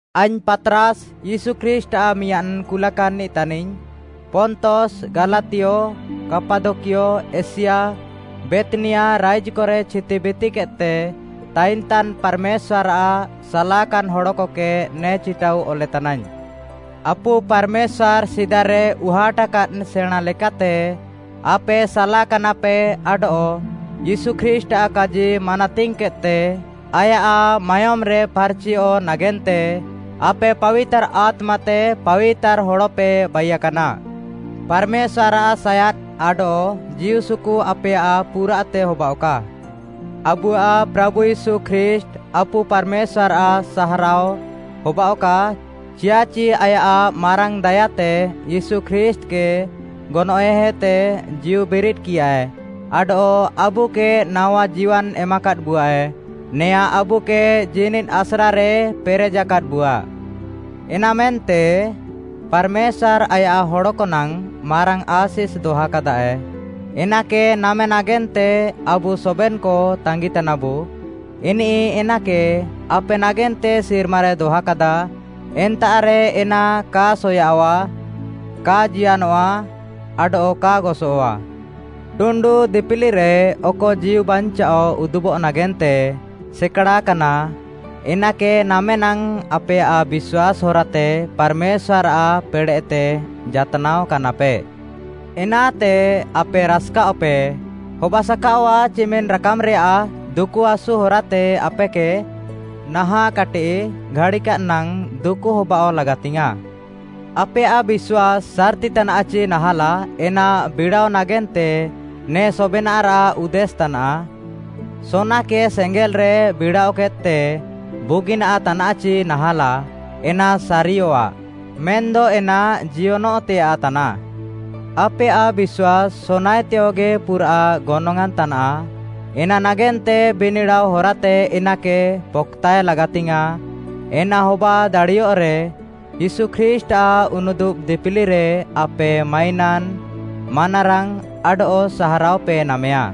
ଆଇଙ୍ଗ୍‌ ପାତ୍‌ରାସ୍‌ ୟୀଶୁ ଖ୍ରୀଷ୍ଟ୍‌ଆଃ ମିଆଁଦ୍‌ କୁଲାକାନ୍‌ନିଃ ତାନିଙ୍ଗ୍‌, ପନ୍ତସ୍‌, ଗାଲାତିୟ, କାପାଦକିଆ, ଏସିଆ, ବେଥ୍‌ନିଆ, ରାଇଜ୍‌କରେ ଛିତିବିତିକେଦ୍‌ତେ ତାଇନଃତାନ୍‌ ପାର୍‌ମେଶ୍ୱାର୍‌ଆଃ ସାଲାକାନ୍‌ ହଡ଼କକେ ନେ ଚିଟାଉ ଅଲେତାନାଇଙ୍ଗ୍‌। ଆପୁ ପାର୍‌ମେଶ୍ୱାର୍‌ ସିଦାରେ ଉହାଟ୍‌କାଦ୍‌ ସେଣାଁଁ ଲେକାତେ ଆପେ ସାଲାକାନାପେ ଆଡଃ ୟୀଶୁ ଖ୍ରୀଷ୍ଟ୍‌ଆଃ କାଜି ମାନାତିଙ୍ଗ୍‌କେଦ୍‌ତେ ଆୟାଃ ମାୟୋମ୍‌ରେ ଫାର୍‌ଚିୟଃ ନାଗେନ୍ତେ ଆପେ ପାବିତାର୍‌ ଆତ୍ମାତେ ପାବିତାର୍‌ ହଡ଼ପେ ବାଇୟାକାନା। ପାର୍‌ମେଶ୍ୱାର୍‌ଆଃ ସାୟାଦ୍‌ ଆଡଃ ଜୀଉସୁକୁ ଆପେୟାଃ ପୁରାଃତେ ହବାଅଃକା। ଆବୁଆଃ ପ୍ରାଭୁ ୟୀଶୁ ଖ୍ରୀଷ୍ଟ୍‌, ଆପୁ ପାର୍‌ମେଶ୍ୱାର୍‌ଆଃ ସାହାରାଅ ହବାଅଃକା, ଚିୟାଃଚି ଆୟାଃ ମାରାଙ୍ଗ୍‌ ଦାୟାତେ ୟୀଶୁ ଖ୍ରୀଷ୍ଟ୍‌କେ ଗନଏଃହେତେ ଜୀଉବିରିଦ୍‌କିୟାଏ, ଆଡଃ ଆବୁକେ ନାୱା ଜୀୱାନ୍‌ ଏମାକାଦ୍‌ବୁଆଏ। ନେଆଁଁ ଆବୁକେ ଜୀନିଦ୍‌ ଆସ୍ରାରେ ପେରେଜାକାଦ୍‍ବୁଆ। ଏନାମେନ୍ତେ ପାର୍‌ମେଶ୍ୱାର୍‌ ଆୟାଃ ହଡ଼କ ନାଙ୍ଗ୍‌ ମାରାଙ୍ଗ୍‌ ଆଶିଷ୍‌ ଦହାକାଦାଏ, ଏନାକେ ନାମେ ନାଗେନ୍ତେ ଆବୁ ସବେନ୍‌କ ତାଙ୍ଗିତାନାବୁ। ଇନିଃ ଏନାକେ ଆପେ ନାଗେନ୍ତେ ସିର୍ମାରେ ଦହାକାଦା। ଏନ୍ତାଃରେ ଏନା କା ସୟାଃୱା, କା ଜିୟନଃଆ, ଆଡଃ କା ଗସଃଆ। ଟୁଣ୍ଡୁ ଦିପିଲିରେ ଅକ ଜୀଉବାଞ୍ଚାଅ ଉଦୁବଃ ନାଗେନ୍ତେ ସେକାଡ଼ାକାନା, ଏନାକେ ନାମେ ନାଙ୍ଗ୍‌ ଆପେୟାଃ ବିଶ୍ୱାସ୍‌ ହରାତେ ପାର୍‌ମେଶ୍ୱାର୍‌ଆଃ ପେଡ଼େଃତେ ଜାତ୍‌ନାଅ କାନାପେ। ଏନାତେ ଆପେ ରାସ୍‌କାଅଃପେ। ହବାସାକାଅଆଃ ଚିମିନ୍‌ ରାକାମ୍‌ରେୟାଃ ଦୁକୁହାସୁ ହରାତେ ଆପେକେ ନାହାଁଃ କାଟିଃ ଘାଡ଼ିକାଦ୍‌ ନାଙ୍ଗ୍‌ ଦୁକୁ ହବାଅଃ ଲାଗାତିଙ୍ଗ୍‌ୟାଁଃ। ଆପେୟାଃ ବିଶ୍ୱାସ୍‌ ସାର୍‌ତିତାନାଃଚି ନାହାଁଲାଃ ଏନା ବିଡ଼ାଅ ନାଗେନ୍ତେ ନେ ସବେନାଃରାଃ ଉଦ୍ଦେଶ୍‌ ତାନାଃ। ସୋନାକେ ସେଙ୍ଗେଲ୍‌ରେ ବିଡ଼ାଅକେଦ୍‌ତେ ବୁଗିନାଃ ତାନାଃଚି ନାହାଁଲାଃ ଏନା ସାରିୟଃଆ, ମେନ୍‌ଦ ଏନା ଜିୟନଃତେୟାଃ ତାନାଃ। ଆପେୟାଃ ବିଶ୍ୱାସ୍‌ ସୋନାଏତେୟଗି ପୁରାଃ ଗନଙ୍ଗ୍‌ଆଁନ୍‌ ତାନାଃ ଏନା ନାଗେନ୍ତେ ବିନିଡ଼ାଅ ହରାତେ ଏନାକେ ପକ୍‌ତାଏ ଲାଗାତିଙ୍ଗ୍‌ୟାଁଃ। ଏନା ହବା ଦାଡ଼ିୟଃରେ, ୟୀଶୁ ଖ୍ରୀଷ୍ଟ୍‌ଆଃ ଉନୁଦୁବ୍‌ ଦିପିଲିରେ ଆପେ ମାଇନାନ୍‌, ମାନାରାଙ୍ଗ୍‌, ଆଡଃ ସାହାରାଅପେ ନାମେୟା।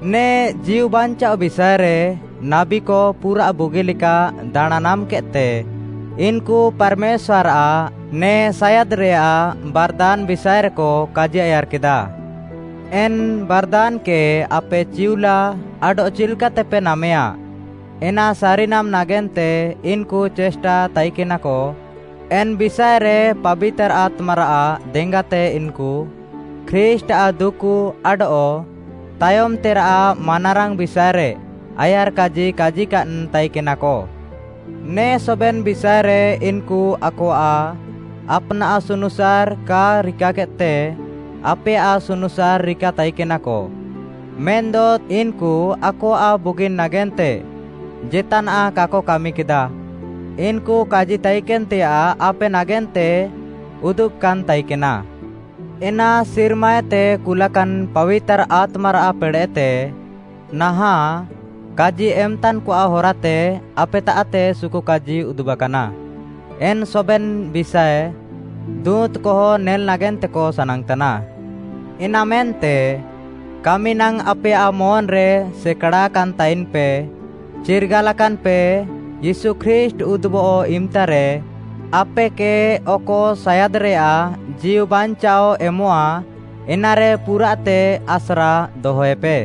ନେ ଜୀଉବାଞ୍ଚାଅ ବିଷାଏରେ ନାବୀକ ପୁରାଃ ବୁଗିଲେକା ଦାଣାଁଁ ନାମ୍‌କେଦ୍‌ତେ ଇନ୍‌କୁ ପାର୍‌ମେଶ୍ୱାର୍‌ଆଃ ନେ ସାୟାଦ୍‌ରେୟାଃ ବାର୍‌ଦାନ୍‌ ବିଷାଏରେକ କାଜିଆୟାର୍‌କେଦା। ଏନ୍‌ ବାର୍‌ଦାନ୍‌କେ ଆପେ ଚିଉଲା ଆଡଃ ଚିଲ୍‍କାତେପେ ନାମେୟା, ଏନା ସାରିନାମ୍‌ ନାଗେନ୍ତେ ଇନ୍‌କୁ ଚେଷ୍ଟା ତାଇକେନାକ। ଏନ୍‌ ବିଷାଏରେ ପାବିତାର୍‌ ଆତ୍ମାରାଃ ଦେଙ୍ଗାତେ ଇନ୍‌କୁ ଖ୍ରୀଷ୍ଟ୍‌ଆଃ ଦୁକୁ ଆଡଃ ତାୟମ୍‌ତେରାଃ ମାନାରାଙ୍ଗ୍‌ ବିଷାଏରେ ଆୟାର୍‌କାଜି କାଜିକାଦ୍‌ ତାଇକେନାକ। ନେ ସବେନ୍‌ ବିଷାଏରେ ଇନ୍‌କୁ ଆକଆଃ ଆପ୍‌ନାଃ ସୁନୁସାର୍‌ କା ରିକାକେଦ୍‌ତେ ଆପେୟାଃ ସୁନୁସାର୍‌ ରିକା ତାଇକେନାକ, ମେନ୍‌ଦ ଇନ୍‌କୁ ଆକଆଃ ବୁଗିନ୍‌ ନାଗେନ୍ତେ ଜେତ୍‌ନାଃ କାକ କାମିକେଦା। ଇନ୍‌କୁ କାଜି ତାଇକେନ୍‌ତେୟାଃ ଆପେ ନାଗେନ୍ତେ ଉଦୁବ୍‌କାନ୍‌ ତାଇକେନା। ଏନା ସିର୍ମାଏତେ କୁଲାକାନ୍‌ ପାବିତାର୍‌ ଆତ୍ମାରାଃ ପେଡ଼େଃତେ ନାହାଁଃ କାଜି ଏମ୍‌ତାନ୍‌କଆଃ ହରାତେ ଆପେତାଃତେ ସୁକୁକାଜି ଉଦୁବାକାନା, ଏନ୍‌ ସବେନ୍‌ ବିଷାଏ ଦୁଁତ୍‌କହ ନେଲ୍‌ ନାଗେନ୍ତେକ ସାନାଙ୍ଗ୍‌ତାନା। ଏନାମେନ୍ତେ, କାମି ନାଙ୍ଗ୍‌ ଆପେୟାଃ ମନ୍‌ରେ ସେକାଡ଼ାକାନ୍‌ ତାଇନ୍‌ପେ। ଚିର୍ଗାଲାକାନ୍‌ପେ, ୟୀଶୁ ଖ୍ରୀଷ୍ଟ୍‌ ଉଦୁବଃ ଇମ୍‌ତାରେ ଆପେକେ ଅକ ସାୟାଦ୍‌ରେୟାଃ ଜୀଉବାଞ୍ଚାଅ ଏମଃଆ ଏନାରେ ପୁରାଃତେ ଆସ୍ରା ଦହେପେ।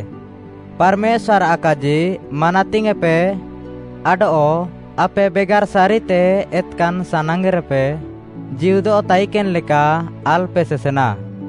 ପାର୍‌ମେଶ୍ୱାର୍‌ଆଃ କାଜି ମାନାତିଙ୍ଗ୍‌ପେ, ଆଡଃ ଆପେ ବେଗାର୍‌ ସାରିତେ ଏତ୍‌କାନ୍‌ ସାନାଙ୍ଗ୍‌ରେପେ ଜୀହୁଦଃ ତାଇକେନ୍‌ ଲେକା ଆଲ୍‌ପେ ସେସେନା।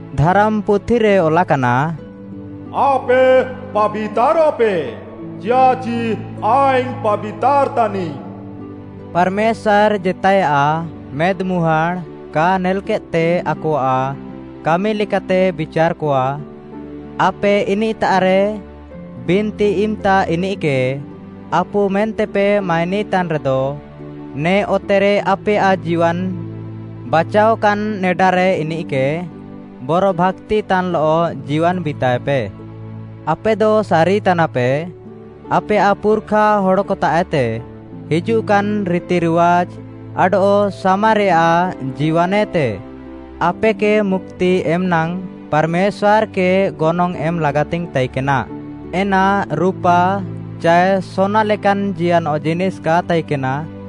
ଧାରାମ୍‌ପୁଥିରେ ଅଲାକାନା, “ଆପେ ପାବିତାରଃପେ ଚିୟାଃଚି ଆଇଙ୍ଗ୍‌ ପାବିତାର୍‌ ତାନିଙ୍ଗ୍‌।” ପାର୍‌ମେଶ୍ୱାର୍‌ ଜେତାଏୟାଃ ମେଦ୍‌ମୁହାଁଡ଼୍‌ କା ନେଲ୍‌କେଦ୍‌ତେ ଆକଆଃ କାମି ଲେକାତେ ବିଚାର୍‌କଆ। ଆପେ ଇନିଃତାଃରେ ବିନ୍ତି ଇମ୍‌ତା ଇନିଃକେ ଆପୁ ମେନ୍ତେପେ ମାଇନିତାନ୍‌ରେଦ, ନେ ଅତେରେ ଆପେୟାଃ ଜୀୱାନ୍‌ ବାଚାଅକାନ୍‌ ନେଡାରେ ଇନିଃକେ ବରଭାକ୍ତିତାନ୍‌ଲଃ ଜୀୱାନ୍‌ ବିତାଏପେ। ଆପେଦ ସାରିତାନାପେ, ଆପେୟାଃ ପୁର୍‌ଖା ହଡ଼କତାଃଏତେ ହିଜୁଃକାନ୍‌ ରିତିରିୱାଜ୍‌ ଆଡଃ ସାମାରେୟାଃ ଜୀୱାନ୍‌ଏତେ ଆପେକେ ମୁକ୍ତି ଏମ୍‌ ନାଙ୍ଗ୍‌ ପାର୍‌ମେଶ୍ୱାର୍‌କେ ଗନଙ୍ଗ୍‌ ଏମ୍‌ ଲାଗାତିଙ୍ଗ୍‌ ତାଇକେନା। ଏନା ରୁପା ଚାଏ ସୋନା ଲେକାନ୍‌ ଜିୟନଃ ଜିନିଷ୍‌ କା ତାଇକେନା,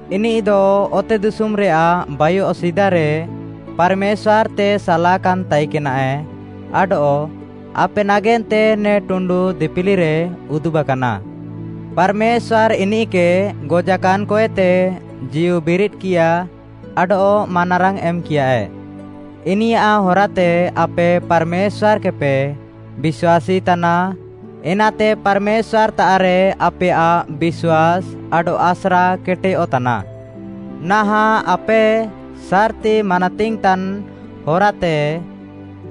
ଇନିଃଦ ଅତେଦିଶୁମ୍‌ରେୟାଃ ବାଇୟଃ ସିଦାରେ ପାର୍‌ମେଶ୍ୱାର୍‌ତେ ସାଲାକାନ୍‌ ତାଇକେନାଏ ଆଡଃ ଆପେ ନାଗେନ୍ତେ ନେ ଟୁଣ୍ଡୁ ଦିପିଲିରେ ଉଦୁବାକାନା। ପାର୍‌ମେଶ୍ୱାର୍‌ ଇନିଃକେ ଗଜାକାନ୍‌କଏତେ ଜୀଉବିରିଦ୍‌କିୟା ଆଡଃ ମାନାରାଙ୍ଗ୍‌ ଏମ୍‌କିୟାଏ। ଇନିୟାଃ ହରାତେ ଆପେ ପାର୍‌ମେଶ୍ୱାର୍‌କେପେ ବିଶ୍ୱାସୀ ତାନା, ଏନାତେ ପାର୍‌ମେଶ୍ୱାର୍‌ତାଃରେ ଆପେୟାଃ ବିଶ୍ୱାସ୍‌ ଆଡଃ ଆସ୍ରା କେଟେୟଃ ତାନା। ନାହାଁଃ ଆପେ ସାର୍‌ତି ମାନାତିଙ୍ଗ୍‌ତାନ୍‌ ହରାତେ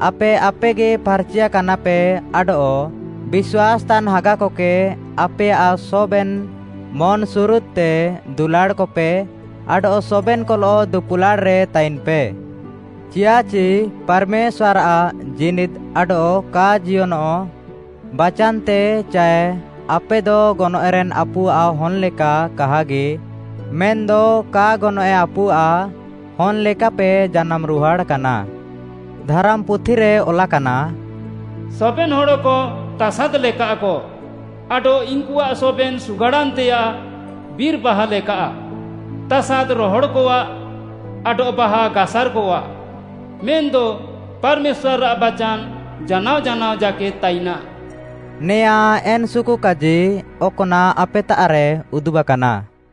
ଆପେ ଆପେଗି ଫାର୍‌ଚିଆକାନାପେ ଆଡଃ ବିଶ୍ୱାସ୍‌ତାନ୍‌ ହାଗାକକେ ଆପେୟାଃ ସବେନ୍‌ ମନ୍‌ସୁରୁଦ୍‌ତେ ଦୁଲାଡ଼୍‌କପେ, ଆଡଃ ସବେନ୍‌କଲଃ ଦୁପୁଲାଡ଼୍‌ରେ ତାଇନ୍‌ପେ। ଚିୟାଃଚି ପାର୍‌ମେଶ୍ୱାର୍‌ଆଃ ଜୀନିଦ୍‌ ଆଡଃ କା ଜିୟନଃ ବାଚାନ୍‌ତେ ଚାଏ ଆପେଦ ଗନଏଃରେନ୍‌ ଆପୁଆଃ ହନ୍‌ ଲେକା କାହାଗି ମେନ୍‌ଦ କା ଗନଏଃ ଆପୁଆଃ ହନ୍‌ ଲେକାପେ ଜାନାମ୍‌ରୁହାଡ଼୍‌କାନା। ଧାରାମ୍‌ପୁଥିରେ ଅଲାକାନା, “ସବେନ୍‌ ହଡ଼କ ତାସାଦ୍‌ ଲେକାଃକ, ଆଡଃ ଇନ୍‌କୁଆଃ ସବେନ୍‌ ସୁଗାଡ଼ାନ୍‌ତେୟାଃ ବିର୍‌ ବାହା ଲେକାଃ। ତାସାଦ୍‌ ରହଡ଼୍‌କଆଃ ଆଡଃ ବାହା ଗାସାର୍‌କଆଃ, ମେନ୍‌ଦ ପାର୍‌ମେଶ୍ୱାର୍‌ଆଃ ବାଚାନ୍‌ ଜାନାଅ ଜାନାଅ ଜାକେଦ୍‌ ତାଇନାଃ।” ନେଆଁ ଏନ୍‌ ସୁକୁକାଜି ଅକ୍‌ନାଃ ଆପେତାଃରେ ଉଦୁବାକାନା।